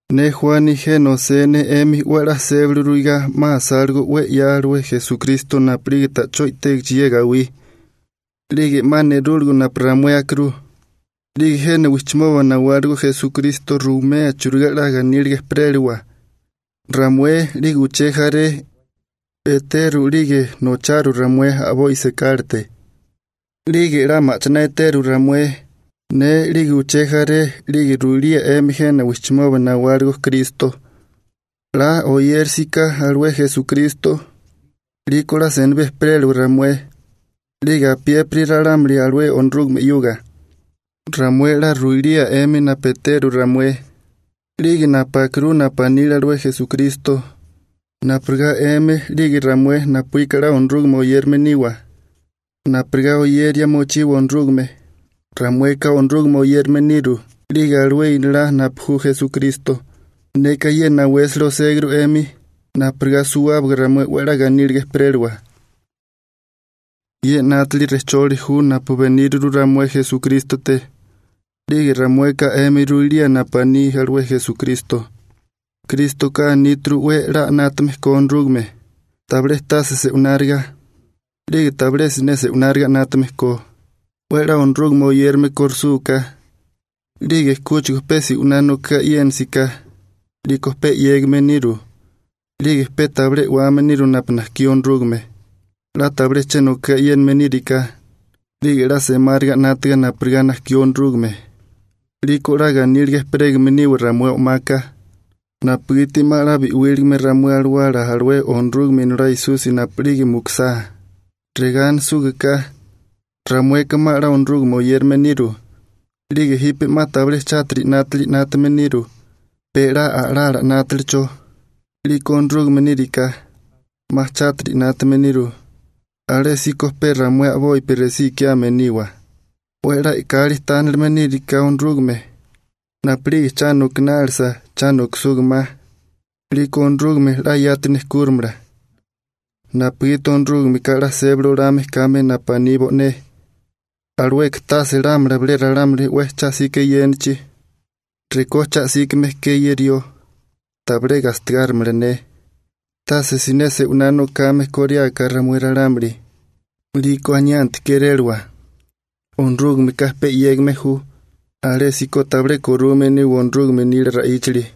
Ne Juani jena osé ne 'emi 'we 'la sébali ruigá 'ma asáligo 'we 'ya alué Esukristo napu'lige ta'chó i'tégichi ye gawí. 'Lige 'ma nerúligo napu ramué akirú. 'Lige jena wijchimoba nawáligo Esukristo ruwimea churigá 'la ganíliga ejperéliwa. Ramué, 'lige uché jaré, eteru 'lige nocharu ramué a'boi sekálate. 'Lige 'la ma'chiná eteru ramué, ne 'lige uché jaré, 'lige ruilía 'emi jena wijchimoba nawáligo Kristo, 'la oyérisiká alué Esukristo 'liko 'la senibí ejperéliwa ramué 'lige apiépiri ralámuli alué Onorúgame 'yuga. Ramué 'la ruiliwa 'emi napu eteru ramué 'lige napu akirú napu anile alué Esukristo, napurigá 'emi 'lige ramué napuíka 'la Onorúgame oyérame niwa, napurigá oyeria mochiwa Onorúgame. Ramueka Onorúgame oyérame niru 'lige alué Inolá napu ju Esukristo. Neka ye nawésali oséguru 'emi napurigá suwábaga ramué 'we 'la ganíliga ejperéliwa. Ye 'nátili rejcholi ju napu beníriru ramué Esukrístote, 'lige ramueka 'emi ruilía napu aní alué Esukristo. Krístoka aníturu 'we 'la 'nátame ko Onorúgame, tabilé tase se'wináriga, 'lige tabilé siné se'wináriga 'nátame ko. 'We 'la Onorúgame oyérame korusúká, 'lige kúchigo pe se'winá nokagá e'yénisiká 'liko pe 'yégame niru, 'lige pe tabilé e'wame niru napu najkí Onorúgame. 'La tabilé che nokagá e'yéname níriká, 'lige 'la semáriga 'nátaga napurigá najkí Onorúgame, 'liko 'la ganíliga ejperégame niwa ramué o'maka, napugiti 'ma 'la bi'wíligame ramué alawala alué Onorúgame Inolá Esusi napu'lige mukisá. Regá anisúgaká: «Ramueka 'ma 'la Onorúgame oyérame niru, 'lige jipe 'ma tabilé chátiri 'nátili 'nátame niru, pe 'la a'lala 'nátalicho.» 'Liko Onorúgame níriká 'ma chátiri 'nátame niru, alésíko pe ramué a'bopi resí ikiame niwa. 'We 'la e'kali tánilime níriká Onorúgame napu'lige cha nokinálisa, cha nokisuga ma, 'liko Onorúgameka 'la yati nejkúrimala, napugiti Onorúgameka 'la sébali olame kame napu aní bo'né, alueka tase lámala bilé ralámuli 'we cha 'sika eyénachi: «Rekó cha 'síkame ke ye rió, tabilé gastigárimala ne.» Tase siné rawé se'winá nokame koriáká ramué ralámuli, 'liko aniánti kérélawa: «Onorúgameka pe 'yégame ju.» Alésíko tabilé korume niwa Onorúgame nila ra'íchali.